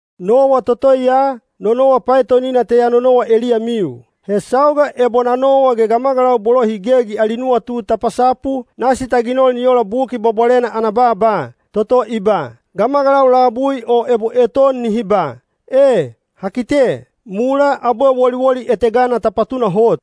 Nowa toto ya, no nowa paetonina te ya nonowa eliyamiu. He sauga ebo na nowa ge gamagalau bolo hi gegi ali nuwatu ta pasapu, nasi ta ginol ni ola Buki Bwabwalena ana baaba, toto i ba, “Gamagalau labui o ebo eton nihi ba, ‘E, ha kite,’ mulaa abwe woliwoli etegana ta patunahot.”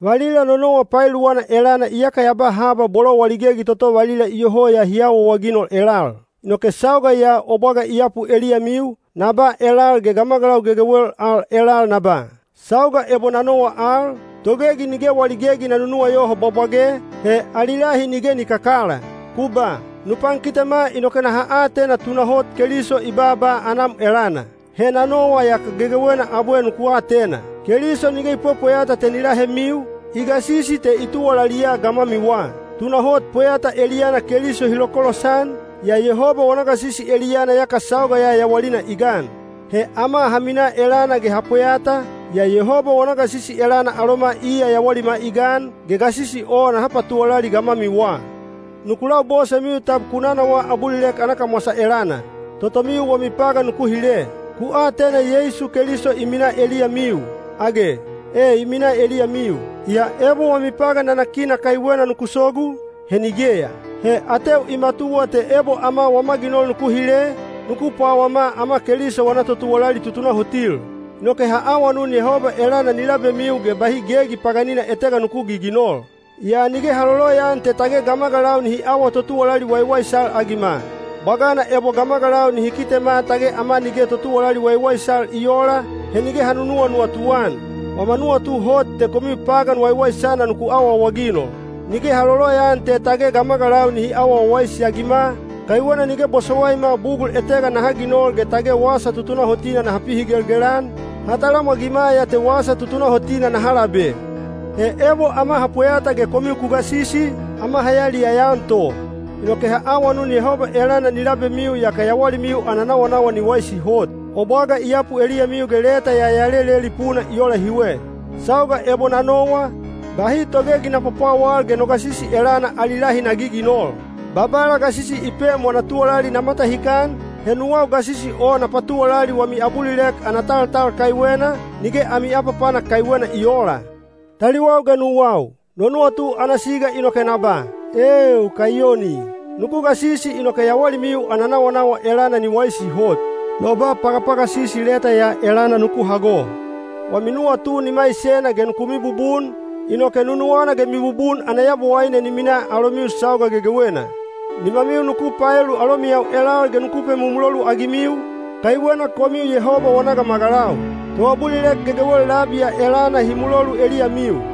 Valila no nowa paeluwana elana iyaka ya ba haba bolo wali gegi toto valila iyoho ya hi awaawaginol elal. Inoke sauga ya o bwaga i yapu eliyamiu, na ba elal ge gamagalau gegewel al elal na ba, “Sauga ebo na nowa al, togegi nige wali gegi na nunuwayoho bwabwage, he ali lahi nige ni kakala.” Ku ba, “Nu pankitema inoke naha atena tunahot Keliso i baaba anam elana.” He na nowa yaka gegewena abwe nuku atena! Keliso nige i pwepweyata te ni lahemiu, i gasisi te i tuwalaliya gamwamiwa. Tunahot pweyata eliyana Keliso hi lokolosan, yaa Yehoba wana gasisi eliyana yaka sauga ya yawalina i gan. He ama ha minaa elana ge ha pweyata, yaa Yehoba wana gasisi elana aloma iya yawalima i gan, ge gasisi o naha patuwalali gamwamiwa. Nuku labosemiu tab ku nanawaa abulilek ana kamwasa elana. Totomiu wami pagan nuku hile. Ku atena Yeisu Keliso i minaa eliyamiu, age? E i minaa eliyamiu, yaa ebo wami pagan nanakina kaiwena nuku sogu, he nigeya. (He ateu i matuwa te ebo ama wama ginol nuku hile, nuku pwawama ama Keliso wana totuwalali tutunahotil.) Inoke ha awanun Yehoba elana ni labemiu ge bahi gegi paganina etega nuku giginol. Yaa nige ha loloyaan te tage gamagalau nihi awa totuwalali waiwaisal-agima. Bwagana ebo gamagalau nihi kitema tage ama nige totuwalali waiwaisal i oola, he nige ha nuwanuwatu-an. Wama nuwatu hot te komiu pagan waiwaisana nuku awaawaginol. Nige ha loloyaan te tage gamagalau nihi awa wawaisi-agima, kaiwena nige bosowaima bugul etega naha ginol ge tage wasa tutunahotina naha pihigelgel-an, ha talamwagima ya te wasa tutunahotina naha labe. He ebo ama ha pweyata ge komiu ku gasisi, ama ha yaliyaya-an to. Inoke ha awanun Yehoba elana ni labemiu yaka yawalimiu ana nawanawa ni waisi hot. O bwaga i yapu eliyamiu ge leta ya ya leleli puna i ola hiwe. Sauga ebo na nowa, bahi togegi na pwapwawal ge no gasisi elana ali lahi na giginol. Babala gasisi i pem wana tuwalali na matahikan, he nuwau gasisi o na patuwalali wami abulilek ana taltal kaiwena, nige ami apapanak kaiwena i oola. Taliwau ge nuwau, no nuwatu ana siga inoke na ba, “Eeu, kaiyoni!” Nuku gasisi inoke yawalimiu ana nawanawa elana ni waisi hot. No ba pagapagasisi leta ya elana nuku hago. Wami nuwatu ni maisena ge nuku mibubun, inoke nunuwana ge mibubun ana Yabowaine ni minaa alomiu sauga gegewena. Nimamiu nuku paelu alomiyau elal ge nuku pemumulolu-agimiu, kaiwena komiu Yehoba wana gamagalau. Toabulilek gegewel labi ya elana hi mulolu eliyamiu.